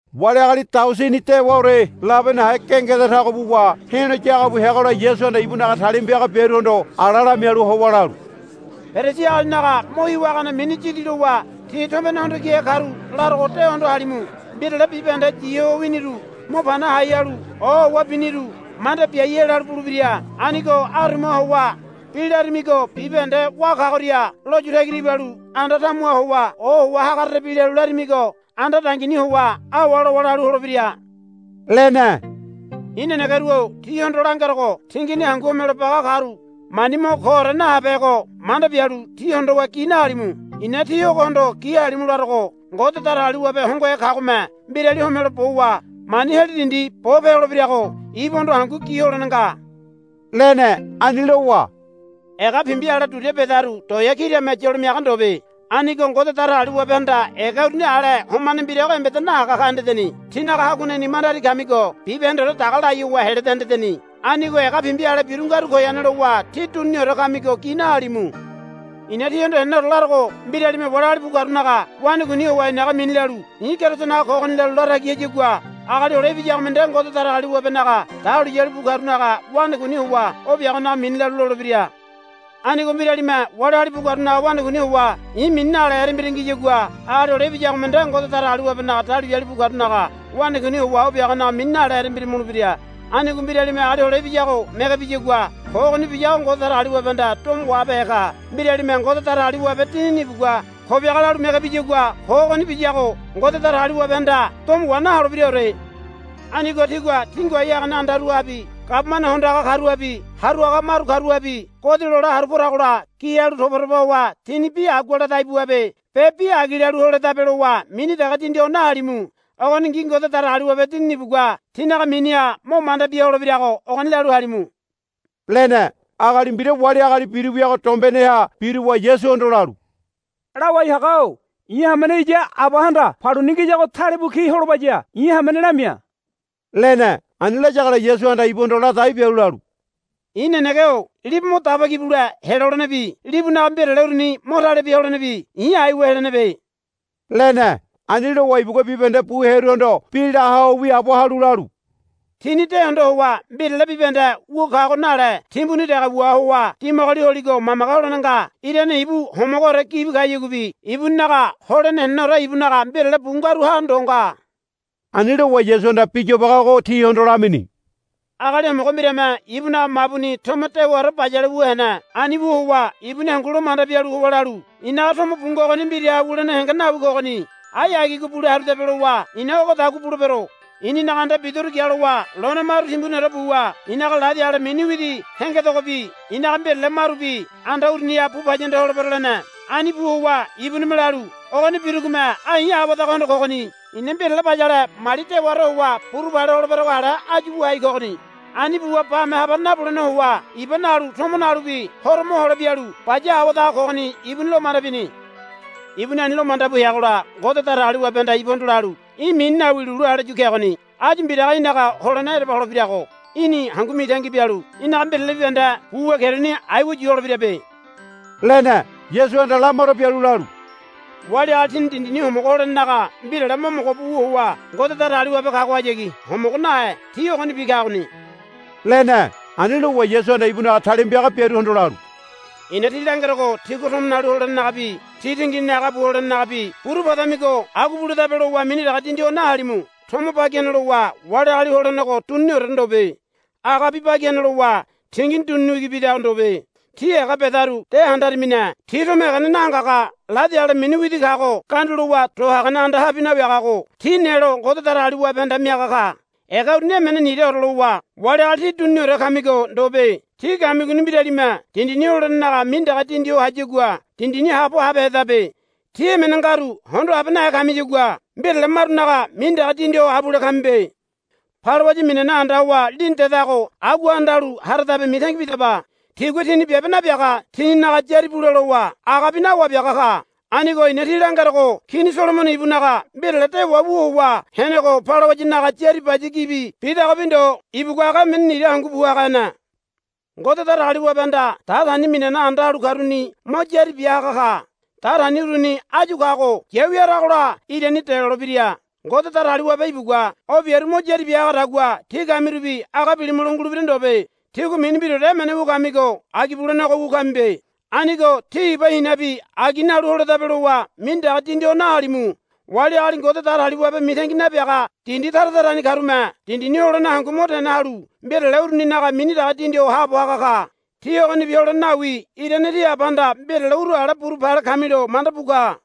Wali agali daosini dewaore labe nahe gengeda tago buwa he̱lo ya haga bu heagola Yasuhanda ibunaga talima piaga biaruhondo ala lamialu howa lalu, Perisi agalinaga mo hiwa hagane mini yidi lowa ti tombene hondo kihe karu larogo de hondo halimu. Mbirale bibahende yi ho winiru mo pana hai halu ohowa biniru manda biai helalu bulebira. Anigo arumaha howa bi larimigo bibahende wá kagoria lo yu tagira ibalu anda tamuha howa ohowa hagarerebi lalu larimigo anda dangini howa awa lowa lalu holebira, lene. I̱ nenegeru-o tíhondo langerogo tingini hangu homelo baga karu mani mo koore nahabehego manda bialu ti hondowa gi nahalimu. I̱na tí ogohondo gi halimu larogo Ngode Datagaliwabe hongohe kagome mbirali homelo bowa mani heli dindi bo pe holebirago ibuhondo hangu gi holene nga, lene. Ani lowa, Ega pimbi ale duria bedaru toea kirame yolo miaga ndobe. Anigo Ngode Datagaliwabehanda ega uruni ale homane mbira embeda nahaga ka hendeni. Tínaga haguaneni mandari kamigo bibahendeore daga lai howa heleda hendeni. Anigo ega pimbi ale biru ngaru goyane lowa tí duniniore kamigo gi nahalimu. I̱na tíhondo heneneore larogo. Mbiralime wali agali bu karunaga wanakuini howa i̱naga mini lalu, I̱ Kerisonaga kogoni, lalu la tagi hayagua Agali Hole Ibiyagome nde Ngode Datagaliwabenaga dahuliyali bu karunaga wanakuini howa o biagonaga mini lalu lolebira. Anigo mbiralime wali agali bu karunaga wanakuini howa i̱ mini nale erembira ngiyagua Agali Hole Ibiyagome nde Ngode Datagaliwabenaga dahuliyali bu karunaga wanakuini howa o biagonaga mini nale erembira mulebira. Anigo mbiralime Agali Hole Ibiyago mege biyagua ko ogoni biyago Ngode Datagaliwabehanda domo wahabehe ka. Mbiralime, Ngode Datagaliwabe Dinini ibugua ko biaga, lalu mege biyagua ko ogoni biyago Ngode Datagaliwabehanda domo wa naholebiraore. Anigo tigua tí ngoai hagane andaruhabi gabumane hondo haga karuhabi haru haga maru karuhabi godi lole haru poragola gi halu toba toba howa tíni, Bi agua la dai buabe be bi agi lalu holedabe, lowa mini dege dindi ho nahalimu. Ogoningi Ngode Datagaliwabe Dinini ibugua tínaga miniha mo manda bia holebirago ogoni lalu halimu, lene. Agali mbira wali agali biru wiago dombeneha biruwa Yasuhondo lalu, Lawai haga-o i̱ hamene iya abahanda paluni ngiyago talebu ki holobaya i̱ hamene lamia, lene. Ani layagola Yasuhanda ibuhondo la dai bialu lalu, I̱ nenege-o libu mo daba ki bule helolenebi libunaga mbirale uruni mo tale bia holenebi i̱ aiwa helenebe, lene. Ani lowa ibugua bibahende bu hearuhondo bi la ho wiaabo halu lalu, Tíni de hondo howa mbirale bibahende wu kago nale timbuni dege wua howa dimagoli holigo mamage holene nga. Irane ibu homogoore gibi kayaguabi ibuninaga holene heneneore ibunaga mbirale bu ngaruha ndo nga. Ani lowa Yasuhanda bi yobage ogo tihondo lamini. Agali homogo mbirame ibunaga mabuni tomo dewaore bayale wu hene. Ani wu howa ibuni hangu lo manda bialu howa lalu, I̱naga tomo bu ngogoni mbiraha wulene henge nawi kogoni. Ai agigo bule harudabe, lowa, I̱na ogodagua bulebero. I̱ninaga anda bidoru gialowa lone maru timbuniore buwa i̱naga ladi ale mini widi hengedogobi i̱naga mbirale marubi anda uruniha bu paya anda holebero, lene. Ani bu howa ibunime lalu, Ogoni birugome ai i̱ awadaga hondo kogoni. I̱na mbirale bayale mali dewaore howa buru pale holeberago ale áyu wu hai kogoni. Ani buwa bame habane nabulene howa iba nalu tomo nalubi horo mohole bialu baya awadaga kogoni, ibuni lo manda bini. Ibuni ani lo manda bu heagola Ngode Datagaliwabehanda ibuhondo lalu, Í̠ mini nawi lulu ale yu kegoni. Áyu mbiraga í̠naga holene ereba holebirago í̠ni hangu mitangi bialu í̠naga mbirale bibahende bu wu keruni aiwa yu holebirabe, lene. Yasuhanda lamaro bialu lalu, Wali agali tini dindini homogo holenenaga mbirale mo mogo bu wu howa Ngode Datagaliwabe kagohayagi homogo nahe ti ogonibi kagoni, lene. Ani lowa Yasuhanda ibunaga talima piaga biaruhondo lalu, I̱na tí langerogo tígua tomo nalu holenenagabi tí tinginini aga bu holenenagabi buru padamigo agua buledabe lowa mini dege dindi ho nahalimu. Tomo bagi hene lowa wali agali holenego duniniore ndobe. Agabi bagi hene lowa tingini dunini wigi bidago ndobe. Tí ega bedaru de handaramine. Ti tomo egene nahangaga ladi ale mini widi kago gandu lowa do hagane andahabi nawiagago ti nelo Ngode Datagaliwabehanda miaga ka. Ega uruni emene niraore lowa wali agali tí dunini kamigo ndobe. Tí kamigoni mbiralime dindini holenenaga mini dege dindi ho hayagua dindini haabo habehedabe. Tí emene ngaru hondo habe nahe kamiyagua mbirale marunaga mini dege dindi ho abule kamibe. Balawaya minana anda howa lini dedago agua anda halu haradabe mitangi bidaba. Tigua tini biabe nabiaga tininaga yári bule lowa agabi nawabiaga ka. Anigo i̱na tí langerogo Kini Solomono ibunaga mbirale dewa wu howa henego balawayanaga yári baya gibi bidagobi ndo ibugua aga emene nira hangu bu haga hene. Ngode Datagaliwabehanda datani minana anda halu karuni mo yári bia haga ka. Datani uruni áyu kago yawi haragola irani delolebira. Ngode Datagaliwabe ibugua o biaru mo yári bia hagadagua tí kamirubi aga bilimulo ngulebira ndobe. Tígua mini mbiraore emene wu kamigo agi bulenego wu kamibe. Anigo tí iba hinabi agi nalu holedabe lowa mini dege dindi ho nahalimu. Wali agali Ngode Datagaliwabe mitangi nabiaga dindi tara tarani karume dindini holene hangu mo tene halu mbirale uruninaga mini dege dindi ho haabo haga ka. Tí ogonibi holene nawi irane tí Abahanda mbirale uru ale buru pale kamilo manda bu ka.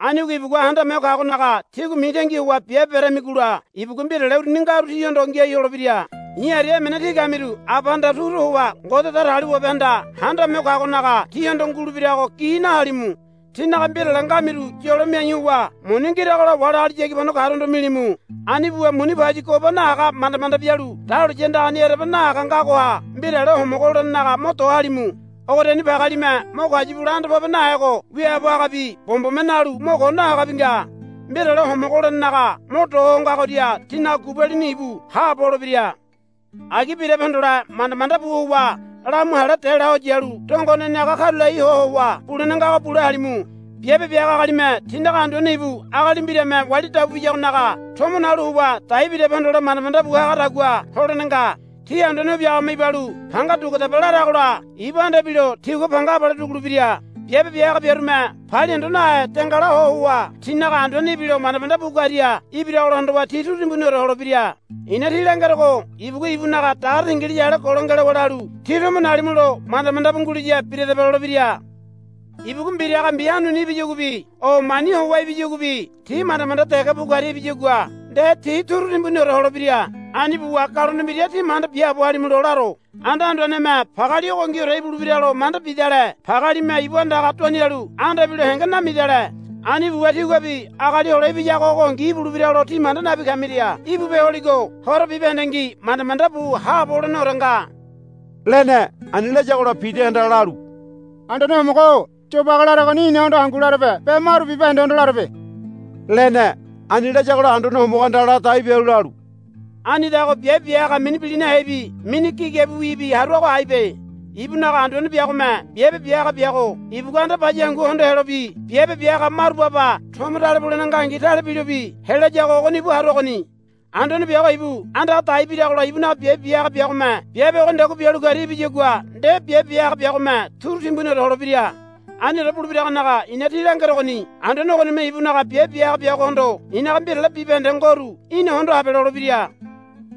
Anigo ibugua Handame Ho Kagonaga tígua mitangi howa biabe beramigola ibugua mbirale uruni ngaru tíhondo ngiai holebira. I̱ aria emene tí kamiru Abahanda turu howa Ngode Datagaliwabehanda Handame Ho Kagonaga tíhondo ngulebirago gi nahalimu. Tínaga mbirale ngamiru yolo miai howa muni ngiragola wali agali yagibano karuhondo milimu. Ani buwa muni pauyi goba nahaga manda manda bialu dahuliya andagani ereba nahaga ngagoha mbirale homogo holenenaga mo do halimu. Ogoriani pagealime mo kayu bule anda pobe nahego wiaabo hagabi bombome nalu mo ko nahagabi nga. Mbirale homogo holenenaga mo do ho ngagoria tínaga gubalini íbu haabo holebira. Agi birabe hondole manda manda bu howa lamu hale dela ho yalu dongoneni aga karulai ho howa bulene ngago bule halimu. Biabe bia haga agalime tinaga anduane ibu agali mbirame wali dabu biyagonaga tomo nalu howa dai birabe hondole manda manda bu hagadagua holene nga. Ti anduane o biagome ibalu, Panga duguadaba, laragola ibu anda ibilo tigua panga abale dugulebira. Biabe bia haga biarume palia hondo nahe dengala ho howa tinaga anduane ibilo manda manda bu karia ibiragola hondowa ti turu timbuniore holebira. I̱na tí langerogo ibugua ibunaga dagare tingiliya ale golo ngelowa lalu, Tí tomo nalimulo manda manda bu nguliya biradaba, lolebira. Ibugua mbiraga mbi hanuni ibiyaguabi o mani howa ibiyaguabi ti manda manda dege bu karia ibiyagua nde ti turu timbuniore holebira. Ani buwa galone mbira tí manda biaabo halimulo laro. Anda anduaneme pageali ogoningiore ibulebiralo manda bidale pagealime ibu andaga duanialu anda ibilo henge namidale. Ani buwa tíguabi Agali Hole Ibiyago ogongi ibulebiralo tí manda nabi kamiria íbu pe holigo horo bibahendengi manda manda bu haabo holeneore nga, lene. Ani layagola Pidahanda lalu, Anduane Homogo-o yobage laregoni inahondo hangu larebe be maru bibahendehondo larebe, lene. Ani layagola Anduane Homogohanda ladai bialu lalu, Anidago biabe bia haga mini bilinahebi mini gigabiwibi haruago aibe. Ibunaga anduane biagome biabe bia haga biago ibugua anda baya hangu hondo helobi biabe bia haga maru baba tomo tale bulene ngangi tale bilobi helayago ogoni ibu haruagoni. Anduane biago ibu andaga dai biragola ibunaga biabe bia haga biagome biabe ogonidagua bialu karia ibiyagua nde biabe bia haga biagome turu timbuniore holebira. Aniore bulebiragonaga i̱na tí langerogoni anduane ogonime ibunaga biabe bia haga biagohondo, I̱naga mbirale bibahende ngoru í̠na hondo habe, lolebira.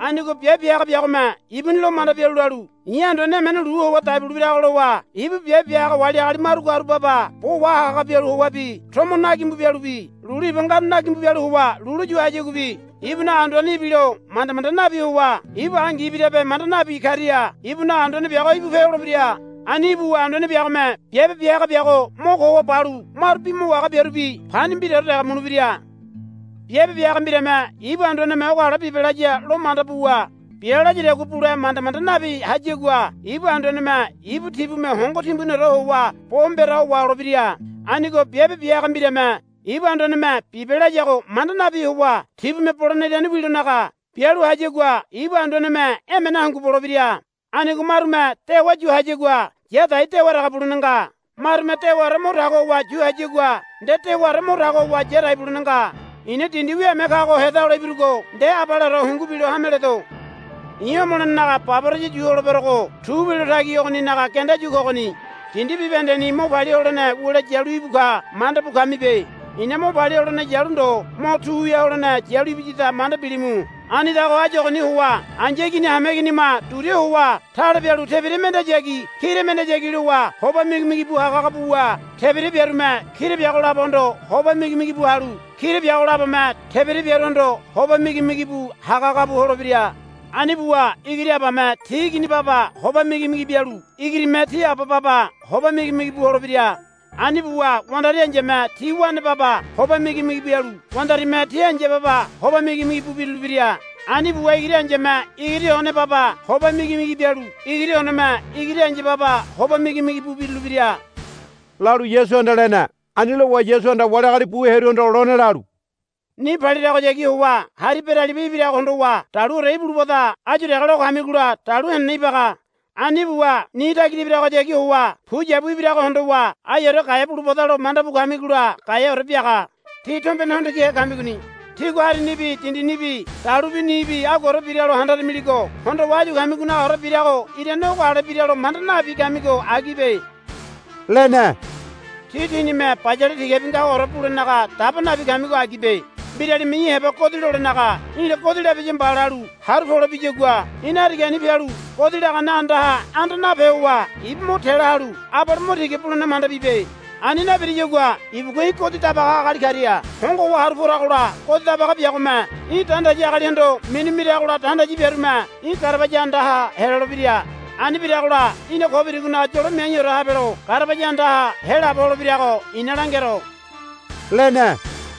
Anigo biabe bia haga biagome ibuni lo manda bialu lalu, I̱ anduane emene lu howa dai bulebirago, lowa ibu biabe bia haga wali agali maru karu baba bo wahaga haga bialu howabi tomo na gimbu bialubi lulu iba ngaru nagimbu bialu howa lulu yu hayaguabi ibunaga anduane ibilo manda manda nabi howa ibu angi ibirabe manda nabi karia ibunaga anduane biago íbu pe holebira. Ani ibuwa anduane biagome biabe bia haga biago mo ko howa balu maru bi mo wahaga biarubi pani mbiraore dege mulebira. Biabe bia haga mbirame ibu anduaneme, Ogo ale bibe, laya lo manda buwa bia layadagua bule manda manda nabi hayagua ibu anduaneme ibu tibume hongo timbuniore howa bo mbera ho waholebira. Anigo biabe bia haga mbirame ibu anduaneme, Bibe, layago manda nabi howa tibume bolene irane wilonaga bialu hayagua ibu anduaneme emene hangu bolebira. Anigo marume dewa yu hayagua ya dai dewa dege bulene nga. Marume dewaore mo tago howa yu hayagua nde dewaore mo tago howa ya dai bulene nga. I̱na dindi wiame kago heda hole ibirugo nde abaleore hungu bilo hame ledo. I̱ homolenenaga baboraya yu holeberogo tu wilo tagi ogoninaga genda yu kogoni. Dindi bibahendeni mo palia holene wule yalu íbu ka manda bu kamibe. I̱na mo palia holene yalu ndo mo tu wia holene yalu ibiyada manda bilimu. Anidago áyu ogoni howa ai̱ya igini hameiginima duria howa tale bialu tebira mendeyagi kira mendeyagi lowa hoba migimigi bu haga haga buwa tebira biarume kira biago labohondo hoba migimigi bu halu kira biago labome tebira biaruhondo hoba migimigi bu haga haga bu holebira. Ani buwa igiri abame ti igini baba hoba migimigi bialu igirime ti aba baba hoba migimigi bu holebira. Ani buwa wandari ai̱yame ti wane baba hoba migimigi bialu wandarime ti ai̱ya baba hoba migimigi bu birulebira. Ani buwa igiri ai̱yame igiri one baba hoba migimigi bialu igiri oneme igiri ai̱ya baba hoba migimigi bu birulebira, lalu Yasuhanda lene. Ani lowa Yasuhanda wali agali bu hearuhondo lone lalu, Ni paliragohayagi howa hari beraliba ibirago hondowa daluore ibulubada áyu dege lo kamigola dalu henene ibaga. Ani buwa ni tagira ibiragohayagi howa puyabu ibirago hondowa aiore gaea bulubadalo manda bu kamigola gaeaore biaga. Tí tombene hondo kihe kamigoni. Tígua harinibi dindinibi dalubi nibi aguaore biralo handaramiligo hondowa áyu kamigonagaore birago irane ogo ale biralo manda nabi kamigo agibe, lene. Tí tínime bayale tigabi ngagoore bulenaga daba nabi kamigo agibe. Mbiralime í̠ heba godi lolenaga, Í̠la godi labiya mba, lalu haru pole biyagua í̠na harigani pialu godi lagane andaha anda nape howa ibu mo te la halu abale mo tiga bulene manda bibe. Ani nabiriyagua ibugua í̠ godi dabaga agali karia hongo howa haru poragola godi dabaga biagome í̠ dandayi agalihondo minu miragola dandayi biarume í̠ garabaya andaha helolebira. Ani biragola í̠na ko birigonaga yolo miaiore habelo garabaya andaha helaabo holebirago i̱na langero, lene.